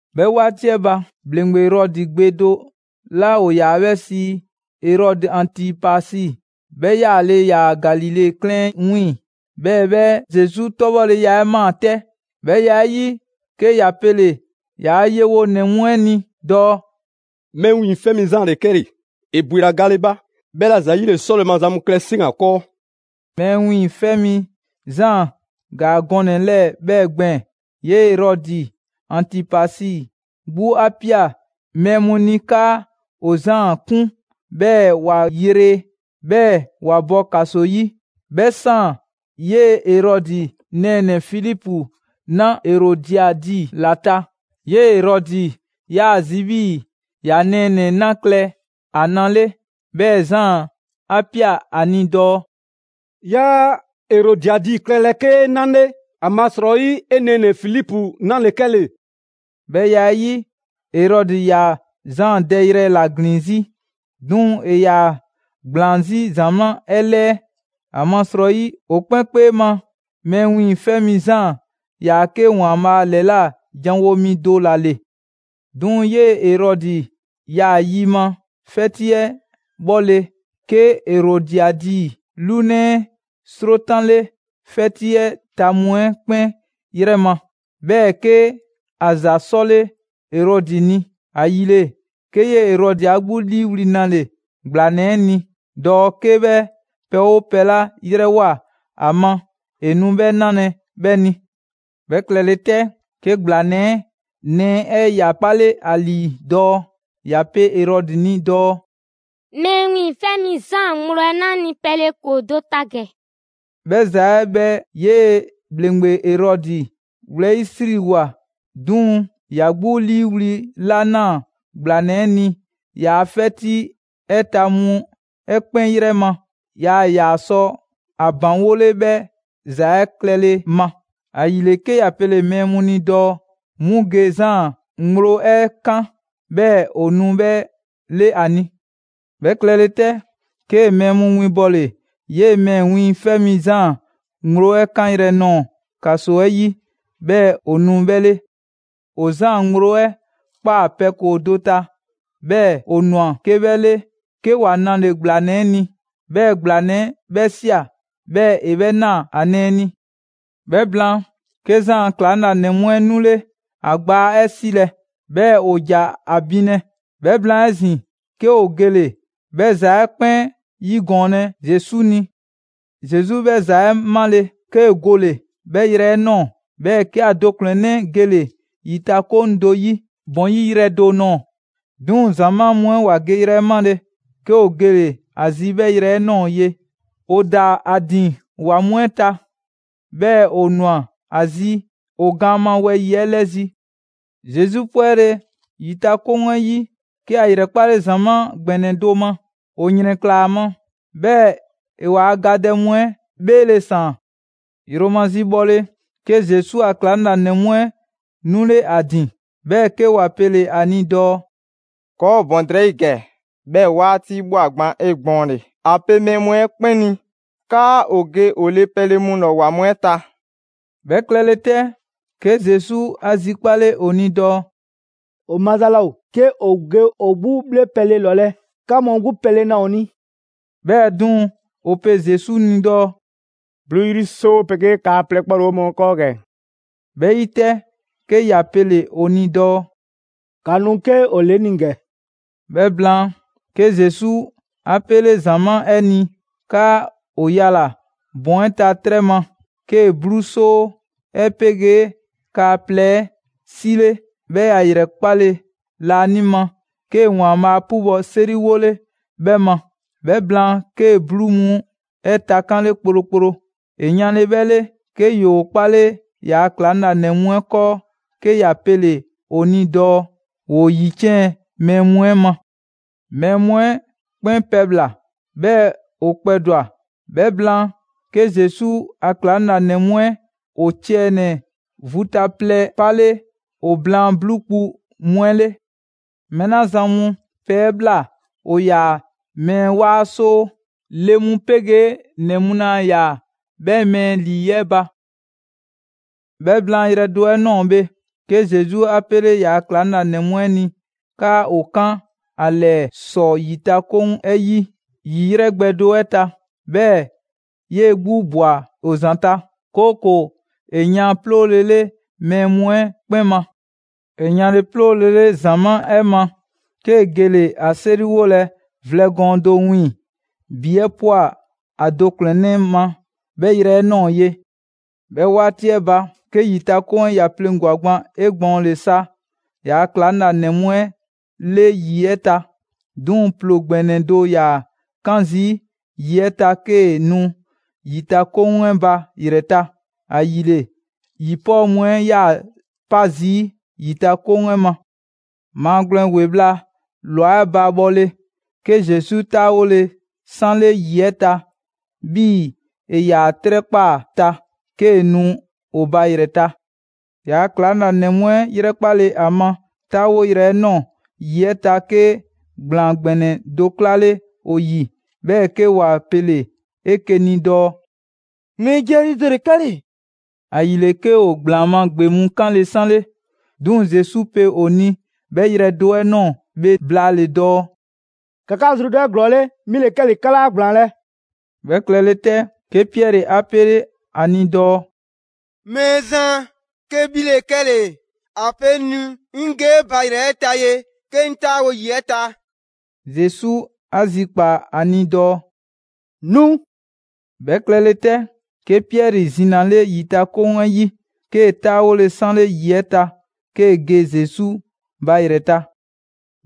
'Bhɛ 'waati 'ɛ ba, ‑Bhleŋgbe Erɔdi gbe do 'la ‑o ‑yaa 'bhɛ sii Erɔdi Antipasi, 'bhɛ 'yaale‑ ‑yaa Galile 'klɛɛn 'ɛ 'wiiŋ‑; 'bhɛɛ‑ 'bhɛ Zesu 'tɔbhɔleya 'ɛ ꞊maa 'tɛ. 'Bhɛ ya 'ɛ 'yi, 'ke ‑ya pele‑ ‑yaa' yewonɛ mu 'ɛ ni dɔɔ: «Mɛɛ Wiiŋfɛ' Mi Zaan ‑le 'kɛle‑! ‑E ‑bwela gale ba. 'Bhɛla‑ ‑zayile 'sɔle‑ maza mu klɛ 'seŋ ‑o ‑a 'kɔɔ.» Mɛɛ Wiiŋfɛ' Mi Zaan ‑gaa gɔnɛ‑ 'lɛɛ‑ 'bhɛɛ‑ gbɛɛn‑. 'Yee‑ Erɔdi Antipasi 'gbu 'a ꞊pia mɛɛ mu ni 'kaa ‑o Zaan 'kun, 'bhɛɛ‑ ‑wa yre, 'bhɛɛ‑ ‑wa bɔ ‑kaso 'yi. 'Bhɛ 'saan‑ 'yee‑ Erɔdi nɛɛnɛ‑ Filipu 'na Erodiadi ‑la ta. 'Yee‑ Erɔdi ‑yaa ‑a zi 'bhii‑ ‑ya nɛɛnɛ‑ 'na klɛ ‑a na 'le, 'bhɛɛ‑ Zaan 'a ꞊pia ‑a ni dɔɔ: «'Yaa Erodiadi klɛlɛ 'kee 'na 'le, ‑amasrɔyi 'e nɛɛnɛ‑ Filipu 'na ‑le 'kɛle‑.» 'Bhɛ ya 'ɛ 'yi, Erɔdi ‑yaa Zaan dɛyrɛ ‑la ‑glin 'zi. 'Duŋ‑ ‑e ‑yaa ‑gblaan 'zi ‑zamaa' 'ɛ 'lɛɛ‑, ‑amasrɔyi ‑o 'kpɛn 'kpee ma, Mɛɛ Wiiŋfɛ' Mi Zaan ‑yaa 'ke ‑Waanbhaa' ‑lɛla' janwo mi do ‑la ‑le. 'Duŋ‑ 'yee‑ Erɔdi 'ya yi ma 'fɛti 'ɛ 'bhɔle‑, 'ke Erodiadi 'lunɛ 'ɛ 'srotanle 'fɛti 'ɛ ta mu 'ɛ 'kpɛn 'yrɛ ma. 'Bhɛɛ‑ 'ke ‑a ‑za 'sɔle‑ Erɔdi ni. ‑Ayile, 'ke 'yee‑ Erɔdi 'a 'gbu 'liiwli‑ 'nale‑ ‑gblanɛ 'ɛ ni dɔɔ 'ke 'bhɛ pɛ 'oo pɛ 'la 'yrɛwoa‑ ‑a ma, ‑e nu 'bhɛ 'nalɛ‑ 'bhɛ ni. 'Bhɛ klɛle 'tɛ, 'ke ‑gblanɛ 'ɛ nɛɛ 'ɛ ‑ya 'kpale ‑a ‑lii dɔɔ ‑ya pe Erɔdi ni dɔɔ: «Mɛɛ Wiiŋfɛ' Mi Zaan ŋgblo 'ɛ 'na 'ŋ ni pɛle ‑koo do ta ‑gɛ.» 'Bhɛ ‑za 'ɛ 'bhɛ 'yee‑ ‑bhleŋgbe Erɔdi 'wlɛyisriwoa, 'duŋ‑ ‑ya 'gbu 'liiwli‑ 'la ꞊naa ‑gblanɛ 'ɛ ni ‑yaa' 'fɛti 'ɛ ta mu 'ɛ 'kpɛn 'yrɛ ma, yaa ‑yaa sɔ ‑a ‑baŋgole 'bhɛ ‑za 'ɛ klɛle ma. ‑Ayile, 'ke ‑ya pele‑ mɛɛ mu ni dɔɔ 'mu ge Zaan ŋgblo 'ɛ 'kan, 'bhɛɛ‑ ‑o nu 'bhɛ 'le ‑a ni. 'Bhɛ klɛle 'tɛ, 'kee‑ mɛɛ mu winbɔle 'yee‑ Mɛɛ Wiiŋfɛ' Mi Zaan ŋgblo 'ɛ 'kanyrɛ‑ nɔɔ‑ ‑kaso 'ɛ 'yi 'bhɛɛ‑ ‑o nu 'bhɛ 'le. ‑O Zaan ŋgblo 'ɛ ꞊kpaa pɛ ‑koo do ta, 'bhɛɛ‑ ‑o ꞊nwa 'ke 'bhɛ 'le, 'ke ‑wa 'nale‑ ‑gblanɛ 'ɛ ni; 'bhɛɛ‑ ‑gblanɛ 'ɛ 'bhɛ ꞊sia, 'bhɛɛ‑ ‑e 'bhɛ 'naa‑ ‑a nɛɛ ni. 'Bhɛ blaan, 'ke Zaan a ‑klaŋlanɛ mu 'ɛ 'nule ‑a gbaa 'ɛ 'silɛ‑, 'bhɛɛ‑ ‑o ‑ja ‑a binlɛ. 'Bhɛ blaan 'ezin‑, 'ke ‑o gele‑ 'bhɛ ‑za 'ɛ 'kpɛn 'yigɔɔnlɛ Zesu ni. Zesu 'bhɛ ‑za 'ɛ 'male‑, 'kee‑ gole‑ 'bhɛ yrɛ 'ɛ ꞊nɔɔ, 'bhɛɛ‑ 'kee‑ ‑a do ‑kplɛnnɛ' gele‑ ‑yitakoŋ do 'yi ‑bɔn 'yi yrɛ do nɔɔ‑. 'Duŋ‑ ‑zamaa' mu 'ɛ ‑wa geyrɛ 'ɛ 'male‑, 'ke ‑o gele‑ ‑a zi 'bhɛ yrɛ 'ɛ ꞊nɔɔ ye. ‑O ‑daa ‑o ‑din ‑wa mu 'ɛ ta, 'bhɛɛ‑ ‑o ꞊nwa ‑a zi ‑o gaan ma wɛyi‑ 'ɛ 'lɛzi‑. Zesu 'pwɛle‑ ‑yitakoŋ 'ɛ 'yi, 'ke ‑a ‑yrɛkpale ‑zamaa' ‑gbɛnɛ do ma. ‑O ‑yrɛnklaa ‑a ma, 'bhɛɛ‑ ‑e ‑waa' gadɛ mu 'ɛ 'bheele‑ ‑saan. Yromazi bhɔle, 'ke Zesu a ‑klaŋlanɛ mu 'ɛ 'nule 'a ‑din, 'bhɛɛ‑ 'ke ‑wa pele‑ ‑a ni dɔɔ: «‑Kɔɔ' ‑o ‑bɔn drɛyi' ‑gɛ, 'bhɛɛ‑ 'waati ꞊bhwa gba 'egbɔɔnle. ‑A pe mɛɛ mu 'ɛ 'kpɛn ni 'kaa ‑o ge ‑o le pɛle mu ‑lɔ ‑wa mu 'ɛ ta.» 'Bhɛ klɛle 'tɛ, 'ke Zesu 'a zikpale ‑o ni dɔɔ: «‑O maza laa ‑o 'ke ‑o ge ‑o 'gbu 'bhle pɛle ‑lɔlɛ', 'ka mu 'gbu pɛle na ‑o ni.» 'Bhɛɛ‑ 'duŋ‑, ‑o pe Zesu ni dɔɔ: «'bluu 'yri 'soo 'pegee kaa plɛ 'kpɔ ‑le 'o mɔɔ 'kɔɔ ‑gɛ.» 'Bhɛ 'yi 'tɛ, 'ke ‑ya pele‑ ‑o ni dɔɔ: «‑Ka nu 'ke ‑o ‑le 'ŋ ni ‑gɛ.» 'Bhɛ blaan, 'ke Zesu 'a 'pele ‑zamaa' 'ɛ ni 'kaa ‑o yala‑ ‑bɔn 'ɛ ta 'trɛ ma; 'kee‑ 'bluu 'soo 'ɛ 'pegee kaa plɛ 'ɛ 'sile, 'bhɛɛ‑ ‑ya ‑yrɛkpale laanima, 'kee‑ ‑Waanbhaa' 'pubɔ‑ 'seriwole 'bhɛ ma. 'Bhɛ blaan, 'kee‑ 'bluu mu 'ɛ takanle kplokplo. ‑E yanle 'bhɛ 'le, 'ke ‑yoo 'kpale ‑yaa' ‑klaŋlanɛ mu 'ɛ 'kɔɔ, 'ke ‑ya pele‑ ‑o ni dɔɔ ‑woo ‑yiciɛn' mɛɛ mu 'ɛ ma. Mɛɛ mu 'ɛ 'kpɛn pɛbhla‑, 'bhɛɛ‑ ‑o kpɛdwa‑. 'Bhɛ blaan, 'ke Zesu a ‑klaŋlanɛ mu 'ɛ ‑o ciɛ ‑nɛ vu ta plɛ 'pale ‑o blaan 'bluu kpu mu 'ɛ 'le. Mɛɛ 'la zan mu pɛ 'ɛ ꞊bhla ‑o ‑yaa mɛɛ 'waa 'soo, le mu 'pegee ‑nɛ mu laa ‑yaa 'bhɛ mɛɛ ‑lii 'ɛ ba. 'Bhɛ blaan yrɛ do 'ɛ ꞊nɔɔ bhe, 'ke Zesu 'a 'pele ‑yaa' ‑klaŋlanɛ mu 'ɛ ni 'kaa ‑o 'kan ‑a ‑lɛɛ ‑sɔ ‑yitakoŋ 'ɛ 'yi, ‑yi 'yrɛ gbɛ do 'ɛ ta. 'Bhɛɛ‑ 'yee‑ 'gbu ꞊bwa ‑o ‑zanta', 'kooko‑ ‑e yan 'ploolele mɛɛ mu 'ɛ 'kpɛn ma. ‑E yanle 'ploolele ‑zamaa' 'ɛ ma, 'kee‑ gele‑ ‑a 'seriwolɛ vlɛ gɔɔn do 'wiiŋ‑. ‑Bi 'ɛ ꞊pwa ‑a do ‑kplɛnnɛ' ma 'bhɛ yrɛ 'ɛ ꞊nɔɔ ye. 'Bhɛ 'waati 'ɛ ba, 'ke ‑yitakoŋ 'ɛ ‑ya pleŋgwa‑ gban 'egbɔɔnle sa ‑yaa' ‑klaŋlanɛ mu 'ɛ 'le ‑yi 'ɛ ta. 'Duŋ‑ ‑ploo ‑gbɛnɛ do ‑yaa 'kan zii' ‑yi 'ɛ ta 'kee‑ nu ‑yitakoŋ 'ɛ ba ‑yrɛ ta, ‑ayile ‑yi 'pɔɔ mu 'ɛ 'yaa‑ 'pa zii' ‑yitakoŋ 'ɛ ma. Maagwlɛn ‑we bhla ꞊lwa 'ɛ ba bhɔle, 'ke Zesu 'taawole 'sanle ‑yi 'ɛ ta 'bhii‑ ‑e ‑yaa 'trɛ 'kpaa‑ ta, 'kee‑ nu ‑o ba ‑yrɛ ta. ‑Yaa' ‑klaŋlanɛ mu 'ɛ ‑yrɛkpale ‑a ma 'taawoyrɛ nɔɔ‑ ‑yi 'ɛ ta, 'ke ‑gblaan ‑gbɛnɛ do 'klale ‑o ‑yi, 'bhɛɛ‑ 'ke ‑wa pele‑ 'eke‑ ni dɔɔ: «Mɛɛ jiɛlii do ‑le 'kɛle‑!» ‑Ayile, 'ke ‑o ‑gblaan ma gbe mu 'kanle‑ 'sanle. 'Duŋ‑ Zesu pe ‑o ni 'bhɛ yrɛ do 'ɛ ꞊nɔɔ bhe blaale‑ dɔɔ: «‑Ka 'ka zrudɔ 'eglɔɔle, 'mi ‑le 'kɛle‑, 'ka 'laa ‑gblaanlɛ'!» 'Bhɛ klɛle 'tɛ, 'ke Piɛri 'a 'pele ‑a ni dɔɔ: «Mɛɛzan, 'ke 'bhi ‑le 'kɛle‑, ‑a pe 'ŋ ni 'ŋ ge 'e ba ‑yrɛ ta ye 'ke 'ŋ 'taawo‑ ‑yi 'ɛ ta.» Zesu 'a zikpaa‑ ‑a ni dɔɔ: «Nu!» 'Bhɛ klɛle 'tɛ, 'ke Piɛri zinale ‑yitakoŋ 'ɛ 'yi, 'kee‑ 'taawole 'sanle ‑yi 'ɛ ta 'kee‑ ge Zesu ba ‑yrɛ ta.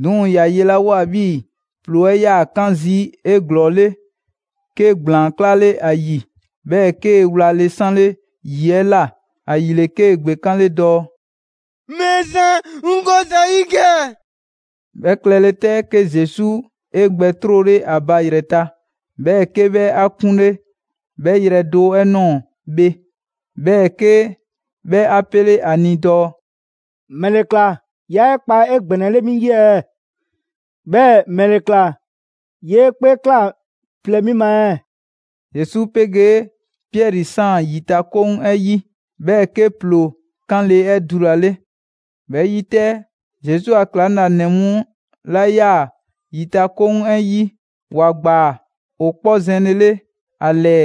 'Duŋ‑ ‑ya yelawoa 'bhii‑ ‑ploo 'ɛ 'yaa‑ 'kan zii' 'eglɔɔle, 'ke ‑gblaan 'klale 'a ‑yi, 'bhɛɛ‑ 'kee‑ wlale 'sanle‑ ‑yi 'ɛ ꞊la. ‑Ayile, 'kee‑ ‑gbekanle dɔɔ: «Mɛɛzan, 'ŋ go ‑za 'yi ‑gɛ!» 'Bhɛ klɛle 'tɛ, 'ke Zesu 'e gbɛ 'trole ‑a ba ‑yrɛ ta, 'bhɛɛ‑ 'ke 'bhɛ 'a 'kunle 'bhɛ yrɛ do 'ɛ ꞊nɔɔ bhe, 'bhɛɛ‑ 'ke 'bhɛ 'a 'pele‑ 'a ni dɔɔ: «‑Mɛle ‑kla 'yaa 'e kpa 'egbɛnɛle 'mi 'yi ɛɛ? 'Bhɛɛ‑ ‑mɛle ꞊kla 'yee 'kpee ꞊kla plɛ 'mi ma ɛɛ?» Zesu 'pegee Piɛri ‑saan ‑yitakoŋ 'ɛ 'yi, 'bhɛɛ‑ 'ke ‑ploo 'kanle‑ 'ɛ dulale. 'Bhɛ 'yi 'tɛ, Zesu a ‑klaŋlanɛ mu 'la 'yaa‑ ‑yitakoŋ 'ɛ 'yi, ‑wa ꞊gbaa ‑o 'kpɔ zɛnlele ‑a ‑lɛɛ,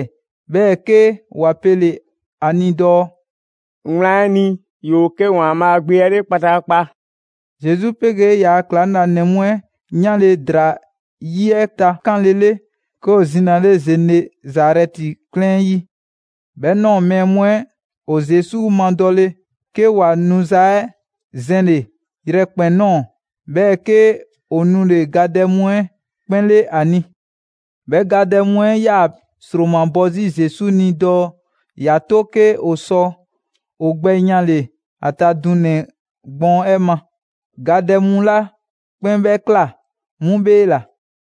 'bhɛɛ‑ 'ke ‑wa pele‑ ‑a ni dɔɔ: «Wlan 'ɛ ni, 'yoo‑ 'ke ‑Waanbhaa' Gbe 'ɛ 'le kpataakpa!» Zesu 'pegee ‑yaa' ‑klaŋlanɛ mu 'ɛ 'yanle‑ ‑draa 'yi 'ɛ takanlele, 'ke ‑o zinale Zenezarɛti 'klɛɛn 'ɛ 'yi. 'Bhɛ ꞊nɔɔ mɛɛ mu 'ɛ ‑o Zesu madɔle, 'ke ‑wa nuza 'ɛ zɛnle‑ yrɛkpɛn‑ ꞊nɔɔ, 'bhɛɛ‑ 'ke ‑o nule‑ gadɛ mu 'ɛ 'kpɛn 'le ‑a ni. 'Bhɛ gadɛ mu 'ɛ 'yaa‑ ‑sromabɔ 'zi Zesu ni dɔɔ ‑ya 'to 'ke ‑o sɔ ‑o gbɛ yanle‑ ‑a ta dunɛ‑ gbɔɔn 'ɛ ma. Gadɛ mu 'la 'kpɛn 'bhɛ ꞊kla 'mu 'bheela‑.